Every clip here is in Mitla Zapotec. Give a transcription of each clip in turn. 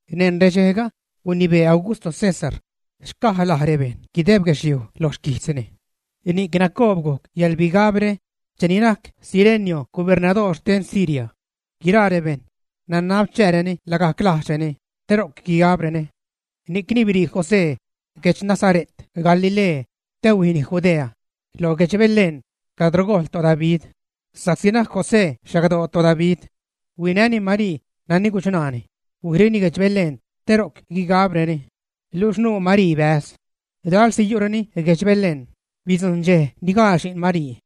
Neṉ redxejga, gunibee Augusto César xcaj laj rebejṉ guideb guedxliuj lo xquijtzni. Ni'c nacobgujc yäḻbigabre cheni najc Cirenio gobernadoor xten Siria. Guiraa rebejṉ nanab chääreni lagajc lajdxreni te ro'c guigabreni. Ni'cni biṟii José guedx Nazare't Galilee, te huijni Judea, lo guedx Belén, cadro gojl toDavid, sa'csi najc José xagdoo toDavid. Huinäni Marii, nani guchṉaani, huijreni guedx Belén te ro'c guigabreni. Luxh nuu Marii bäz. Lalsi yu'reni guedx Belén, bidzujṉ dxej ni gaal xi'n Marii.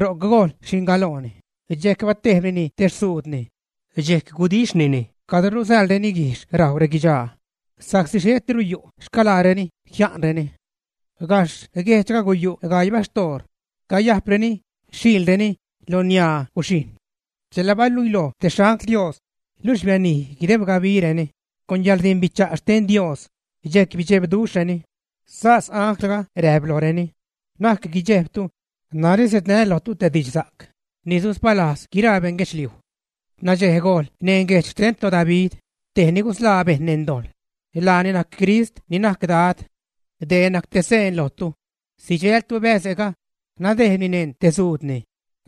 Ro'c gojl xi'n galooni, dxejc batejbnini te xzuudni. Dxejc gudixhnini cadro rusäḻreni guijxh rajw reguidxaa sa'csi xhetiru yu' xcalaareni jia'nreni. Gajxh guejdxga guyu' gaii baxtoor cayajpreni xhiilreni lo niaa guxhijṉ. Chela baluiloj te xangl Dios, luxh bianij guideb gabireni con yäḻrdimbicha' xten Dios, dxejc bidxebduxhreni. Sas anglga räjp lojreni: ―Na'c guidxejbtu, narä siädnää́ lojtu te didxsa'c ni suspalajz guiraa beṉ guedxliuj. N̲adxej gojl neṉ guejdx xten toDavid, tej ni gusḻaa bejṉ neṉ dojḻ, laani najc Crist ni najc Dad. Dee najc te seen lojtu, sidxältu bäze'ga nadejbni neṉ te xzuudni,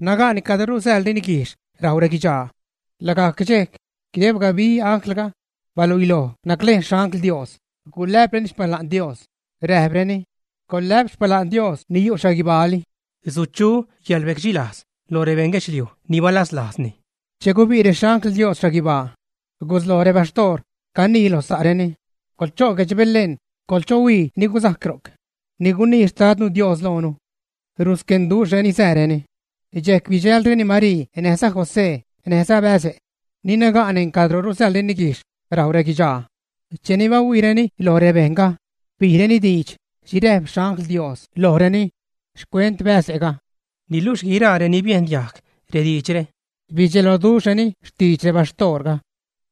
naga'ni cadro rusäḻreni guijxh rajw reguidxaa. Lagajc dxejc guideb gabi anglga baluiloj naclejn xangl Dios, gulä'preni xpala'n Dios, räjpreni: Coḻlä'p xpala'n Dios ni yu' xhaguibaali. Suchu yäḻrbecdxilajz lo rebeṉ guedxliuj ni balazlajzni. Che gubi' rexangl Dios xhaguibaa, gusloj rebaxtoor canii loj sa'reni: ―Coḻcho' guedx Belén coḻchohuii ni guzajc ro'c ni gunii Xtadnu Dios loonu. Rusquenduxhreni sääreni, dxejc bidxälreni Marii näjza José näjza bäze' ni naga' neṉ cadro rusäḻreni guijxh rajw reguidxaa. Cheni bahuiireni loj rebejṉga, bijreni diidx xhi räjp rexangl Dios lojreni xcuent bäze'ga. Niluxh guiraa reni biejn diajg rediidxre bidxeloduxhreni xtidx rebaxtoorga.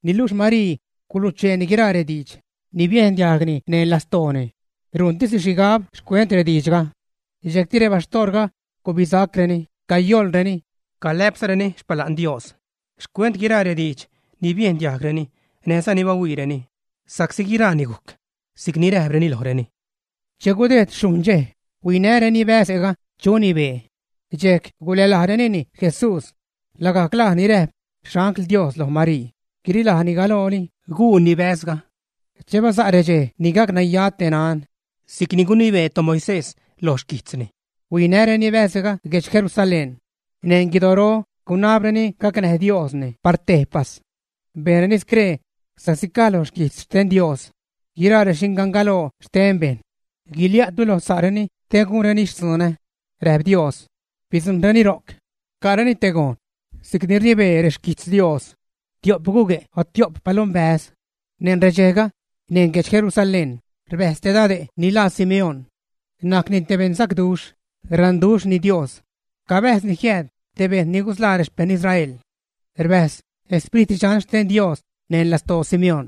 Niluxh Marii gulucheeni guiraa rediidx ni biejn diajgni neṉ lastooni, rujntisni xhigab xcuent rediidxga. Dxejcti rebaxtoorga gubisacreni cayoḻreni, calä'pzareni xpala'n Dios xcuent guiraa rediidx ni biejn diajgreni näjza ni bahuiireni sa'csi guiraani gujc si'cni räjpreni lojreni. Che gudejd xhujṉ dxej, huinäreni bäze'ga chuni bee, dxejc gulälajrenini Jesús, lagajc laj ni räjp xangl Dios loj Marii guirilajni galooli guuni bäzga. Che basa' redxej ni gac naya te nan si'cni gunibee toMoisés loj xquijtzni, huinäjreni bäze'ga guedx Jerusalén, neṉ guidoro gunabreni gacnäj Diosni par tejpas. Bejnreni scree sa'csi caj lo guijtz xten Dios: “Guiraa rexingangaloo xten bejṉ guilia'tu lo sa'reni te gunreni xtzunä”, räjp Dios. Bidzujṉreni ro'c ca'reni te gojn si'cni rnibee rexquijtz Dios: “Tio'p gugue' o tio'p palombäz.” Neṉ redxejga, neṉ guedx Jerusalén rbäjz te dade' ni laa Simeón. Najcni te beṉsacduxh, raṉduxhni Dios, cabäjzni jiääd te bejṉ ni gusḻaa rexpejṉ Israel. Rbäjz Sprit Dxan xten Dios neṉ lastoo Simeón.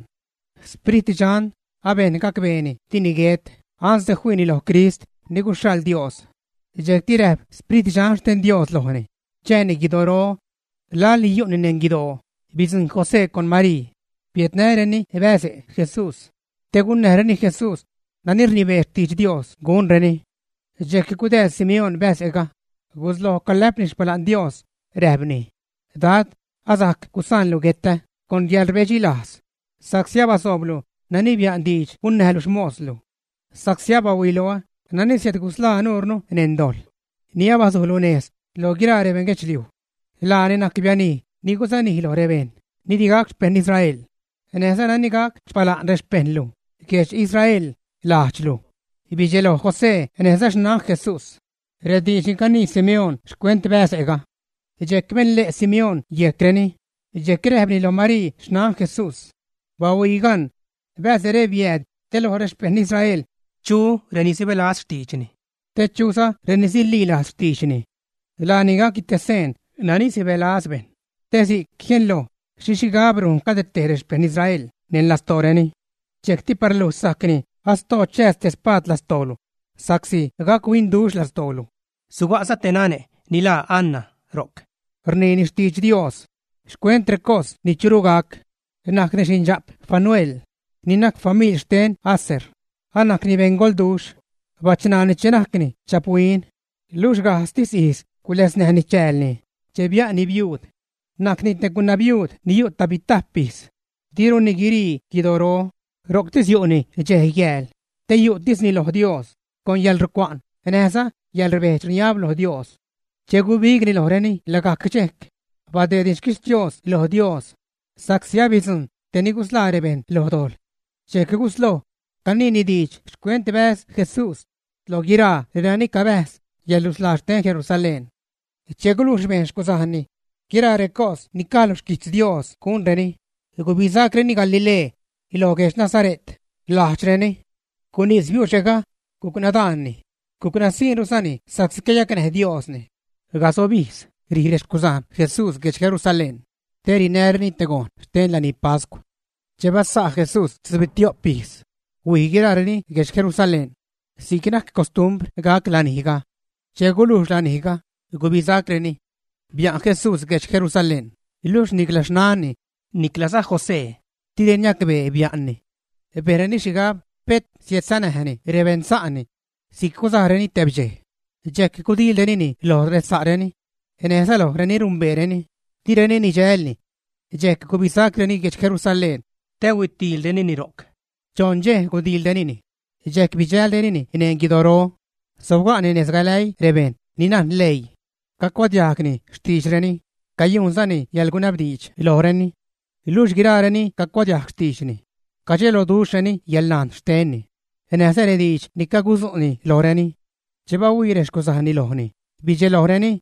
Sprit Dxan abejn gacbeeni dini guet ansde fiini loj Crist ni guxhaḻ Dios. Dxejcti räjp Sprit Dxan xten Dios lojni chääni guidoro. Laḻni yu'ni neṉ guidoo, bidzujṉ José con Marii, biädnäreni bäz Jesús, te gunnäjreni Jesús nani rnibee xtidx Dios gunreni. Dxejc gudääz Simeón bäze'ga, gusloj calä'pni xpala'n Dios, räjpni: Dad, asajc gusaanlu guetä con yäḻrbedxilajz, sa'csi abasooblu nani bia'n diidx gunnäjlu xmoslu. Sa'csi abahuiloä nani siädgusḻaa nuurnu neṉ dojḻ, ni abasujlu nez loj guiraa rebeṉ guedxliuj. Laani najc bianij ni susanij loj rebejṉ ni di gac xpejṉ Israel, näjza nani gac xpala'n rexpejṉlu guedx Israel, lajdxlu. Bidxeloj José näjza xnan Jesús rediidx ni canii Simeón xcuent bäze'ga. Dxejc benle' Simeón yejcreni, dxejc räjpni lo Marii xnan Jesús: ―Bahuii gan; bäze're biääd te loj rexpejṉ Israel chu reni sibälaz xtiidxni, te chuza reni sililajz xtiidxni. Laani gacni te seen nani sibälaz bejṉ, te si'c jienloj xhi xhigab rujn cade tej rexpejṉ Israel neṉ lastooreni. Dxejcti par luj sajcni asdoo chääz te spaad lastoolu, sa'csi gac-huinduxh lastoolu. Suga'za te nane' ni laa Ana ro'c, rniini xtidx Dios xcuent recos ni churu gac. Najcni xindxa'p Fanuel, ni najc famiḻ xten Aser. Anajcni beṉgolduxh. Bachṉaani che najcni dxaphuin, luxh gajdztis ijz guläznäjni chäälni che bia'nni biuud. Najcni te gunabiuud ni yu' tajbitajp ijz. Diruni guirii guidoro, ro'ctis yu'ni dxej, yääl te yu'tisni lo Dios con yäḻrucua'n näjza yäḻrbedx-rniab lo Dios. Che gubigni lojreni lagajc dxejc, badeedni xquixtios lo Dios sa'csi abidzujṉ tej ni gusḻaa rebejṉ lo dojḻ. Dxejc gusloj caniini diidx xcuent bäz Jesús loj guiraa renani cabäjz yäḻrusḻaa xten Jerusalén. Che gulujx bejn xcuzajnni guiraa recos ni caj lo xquijtz Dios gunreni, gubisacreni Galilee, lo guedx Nazare't, lajdxreni. Gunís biuxe'ga, guc nadaanni, guc nasiṉruzani sa'csi cayacnäj Diosni. Casob ijz rij rexcuzajn Jesús guedx Jerusalén te rinäreni te gojn xten lanij pascw. Che basa' Jesús tzubitio'p ijz, huij guiraareni guedx Jerusalén si'c najc costumbr gac lanijga. Che gulujx lanijga, gubisacreni. Bia'n Jesús guedx Jerusalén, luxh nicla xnanni niclaza José direni niacbee bia'nni. Bejnreni xhigab pet siädsanäjni rebeṉsa'ni. Si'c guzajreni tebdxej, dxejc gudiilrenini loj resa'reni, näjza loj reni rumbeereni, direni nidxälni. Dxejc gubisacreni guedx Jerusalén te huitiilrenini ro'c. Choṉ dxej gudiilrenini dxejc bidxälrenini neṉ guidoro, sobga'ni nez galäii rebejṉ ni najn leii, cacuadiajgni xtiidxreni, cayujnzani yäḻgunabdiidx lojreni. Luxh guiraareni cacuadiajg xtiidxni, cadxeloduxhreni yäḻnajn xtenni, näjza rediidx ni cagudzu'ni lojreni. Che bahuii rexcuzajnni lojni, bidxelojreni.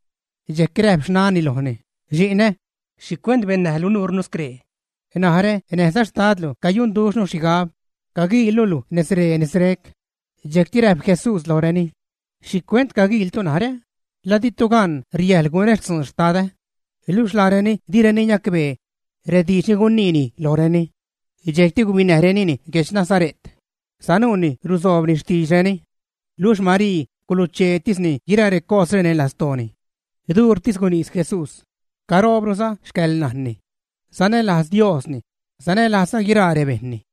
Dxejc räjp xnanni lojni: ―Xi'nä, ¿xhicuent bennäjlu nuurnu scree? Narä näjza xtadlu cayunduxhnu xhigab caguiilnu luj nezree, nezre'c. Dxejcti räjp Jesús lojreni: ―¿Xhicuent caguiiltu narä? ¿La ditu gan riäjḻ gunä xtzun Xtadä, ä? Luxh laareni direni niacbee rediidx ni guniini lojreni. Dxejcti gubinäjnireni guedx Nazare't, sanuuni rusoobni xtiidxreni. Luxh Marii gulucheetisni guiraa recosre neṉ lastooni. Duurtis gunís Jesús, caroobruza xcäḻnajnni. Sanälajz Diosni, sanälajzza guiraa rebejṉni.